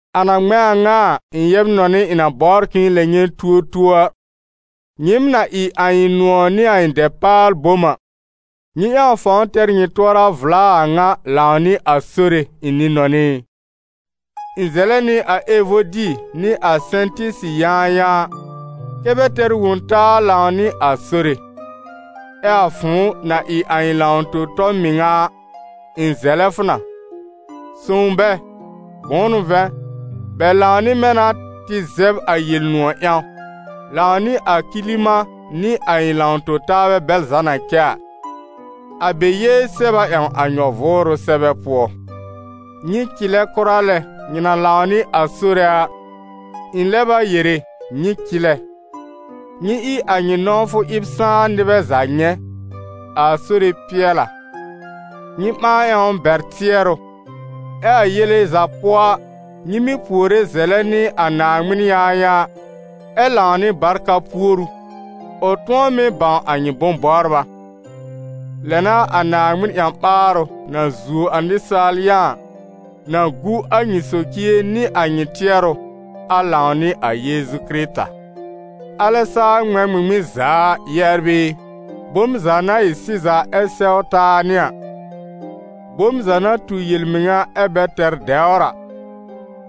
A na ŋmɛ̃ a ŋa a, ɩ̃ yɛb-nɔnɩ ɩ̃ na bɔbr k'ɩ̃ɩ lɛb nyɛ̃ tuo tuo a, nyɩɩm na ɩ a ɩ̃ nʋ̃ɔ̀ nɩ a ɩ̃ dɛpaal-bom a, nyɩ ƴãw fãw tɛr nyɩ tʋɔra vla a a ŋa lãw nɩ a Sore, ɩ̃ nɩ-nɔnɩ ɩ. Ɩ̃ zɛlɛ nɩ a Evodi nɩ a Sɛ̃tɩsi yãayãa, kɛ́ bɛ tɛr wõ-taa lãw nɩ a Sore. Ɛ a fʋ̃ʋ, na ɩ a ɩ̃ lãw-tõ-tɔ mɩŋa a, ɩ̃ zɛlɛ fʋ na: sõw bɛ, bʋ̃ʋ n'ʋ vɛ̃, bɛ lãw nɩ mɛ̃ na tɩ zɛb a Yel-nʋ̃ɔ̀ ƴãw, lãw nɩ a Kilimã nɩ a ɩ̃ lãw-tõ-taabɛ bɛl za na cɛ a. A bɛ yée sɛb a ƴãw a nyɔ-vʋʋrʋ sɛbɛ pʋɔ. Nyɩ cɩlɛ kʋra lɛ nyɩ na lãw nɩ a Sore a, ɩ̃ lɛb a yere: nyɩ cɩlɛ. Nyɩ ɩ a nyɩ nɔ̃wfʋ ɩb sãá nɩbɛ za nyɛ̃. A Sore pɩɛl a. Nyɩ ɓãa ƴãw bɛr tɩɛrʋ, ɛ a yele za pʋɔ a, nyɩ mɩ́ puore zɛlɛ nɩ a Naaŋmɩn yãayãa ɛ lãw nɩ barka puoru, ʋ tʋ̃ɔ mɩ́ bãw a nyɩ bʋ̃-bɔbra. Lɛ n'a a Naaŋmɩn ƴã-ɓaarʋ, na zuo a nɩsaal yã a, na gu a nyɩ socie nɩ a nyɩ tɩɛrʋ, a lãw nɩ a Yeezu Kɩrɩta. Alɛ saa ŋmɛ̃ ŋmɩŋmɩn za a, yɛbr ɩ, bom za na ɩ sɩza ɛ sɛw taa nɩ a, bom za na tu yel-mɩŋa ɛ bɛ tɛr dɛwr a,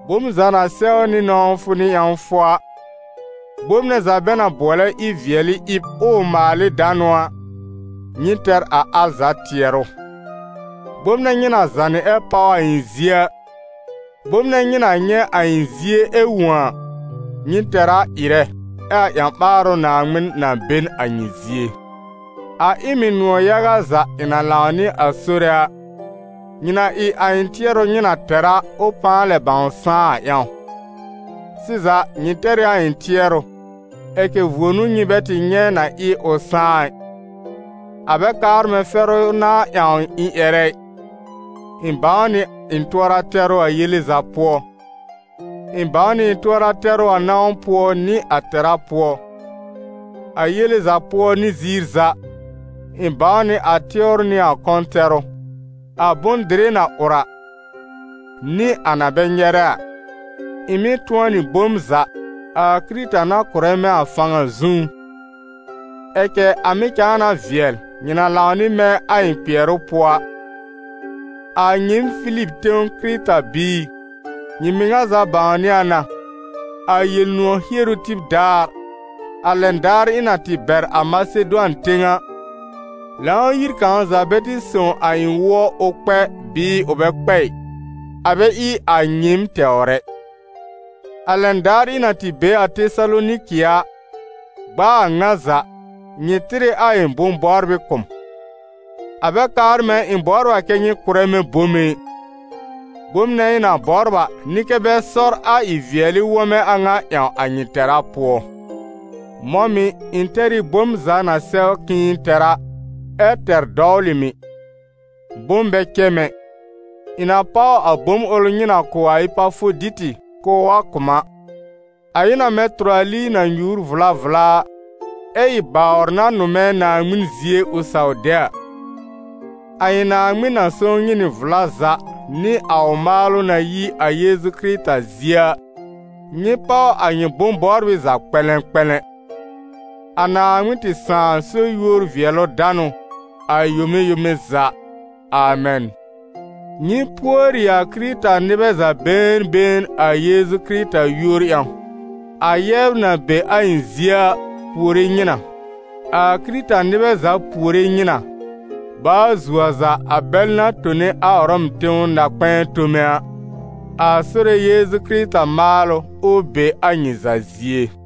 bom za na sɛw nɩ nɔ̃wfʋ nɩ ƴãwfʋ a, bom nɛ za bɛ na bʋɔlɛ ɩ-vɩɛlɩ-ɩb ɛ ʋ maal ɩ danʋ a, nyɩ tɛr a al za tɩɛrʋ. Bom nɛ nyɩ na zànɩ ɛ páw a ɩ̃ zie a, bom nɛ nyɩ na nyɛ̃ a ɩ̃ zie ɛ wõ a, nyɩ tɛr a ɩrɛ, ɛ a ƴã-ɓaarʋ Naaŋmɩn na be n a nyɩ zie. A ɩ m ɩ nʋ̃ɔ̀ yaga za ɩ̃ na lãw nɩ a Sore a, nyɩ na ɩ a ɩ̃ tɩɛrʋ nyɩ na tɛr a, ʋ pãa lɛb sãá a ƴãw. Sɩza, nyɩ tɛr ɩ a ɩ̃ tɩɛrʋ, ɛ cɛ vuo n'ʋ nyɩ bɛ tɩ nyɛ̃ na ɩ ʋ sãá ɩ. A bɛ kaar mɛ̃ fɛrʋ n'a ƴãw ɩ̃ ƴɛrɛ ɩ, ɩ̃ bãw nɩ ɩ̃ tʋɔra tɛrʋ a yele za pʋɔ. Ɩ̃ bãw nɩ ɩ̃ tʋɔra tɛrʋ a nãw pʋɔ nɩ a tɛra pʋɔ. A yele za pʋɔ nɩ ziir za, ɩ̃ bãw nɩ a tɩwr nɩ a kɔ̃ tɛrʋ, a bʋ̃-dɩrɩ na ʋr a, nɩa na bɛ nyɛrɛ a. Ɩ̃ mɩ́ tʋ̃ɔ nɩ bom za, a Kɩrɩta na kʋ̀rɛ mɛ̃ a fãw a zũú. Ɛ cɛ a mɩ̀ cãa na vɩɛl, nyɩ na lãw nɩ mɛ̃ a ɩ̃ kpɩɛrʋ pʋɔ a. A nyɩɩm Filib tẽw Kɩrɩta-biir, nyɩ mɩŋa za bãwnɩ a na, a Yel-nʋ̃ɔ̀ hieru tib daar, a lɛn daar ɩ̃ na tɩ bɛr a Masedʋan tẽw a, Lãw-yir kãw za bɛ tɩ sõw a ɩ̃ wʋɔ ʋ kpɛ bɩɩ ʋ bɛ kpɛ ɩ, a bɛ ɩ a nyɩɩm tɛwr ɛ. A lɛn daar ɩ̃ na tɩ be a Tesaloniki a, gb'a a ŋa za, nyɩ tɩr ɩ a ɩ̃ bʋ̃-bɔbrɩ kʋ̀ m. A bɛ kaar mɛ̃ ɩ̃ bɔbr a kɛ́ nyɩ kʋ̀rɛ mɛ̃ bome ɩ. Bom nɛ ɩ̃ na bɔbr a n'ɩ kɛ bɛ sɔr a ɩ-vɩɛlɩ wɔmɛ̃ a ŋa ƴãw a nyɩ tɛra pʋɔ. Mɔ̃ mɩ̀, ɩ̃ tɛr ɩ bom za na sɛw k'ɩ̃ɩ tɛr a, ɛ tɛr dɔwlɩ mɩ̀. Bom bɛ cɛ mɛ̃ ɩ, ɩ̃ na páw a bom ʋl nyɩ na kʋ̀ a Epafoditɩ k'ʋʋ wa kʋ̀ m a. A ɩ na mɛ̃ tʋrali na nyùur vla vla a, ɛ ɩ bawr na nʋmɛ Naaŋmɩn zie ʋ saw de a. A ɩ̃ Naaŋmɩn na sõw nyɩ nɩ vla za nɩ a ʋ maalʋ na yi a Yeezu Kɩrɩta zie a, nyɩ páw a nyɩ bʋ̃-bɔbrɩ za kpɛ̃lɛ̃kpɛ̃lɛ̃. A Naaŋmɩn tɩ Sãà so yúor-vɩɛlʋ-danʋ a yome yome za, amɛn. Nyɩ pùori a Kɩrɩta-nɩbɛ za been been a Yeezu Kɩrɩta yúor ƴãw. A yɛbr na be a ɩ̃ zie a, puore nyɩ na. A Kɩrɩta-nɩbɛ za puore nyɩ na, baa zuo a za a bɛl na tone a Ʋrɔm tẽw na-kpɛ̃ɛ tome a. A Sore Yeezu Kɩrɩta maalʋ, ʋ be a nyɩ za zie.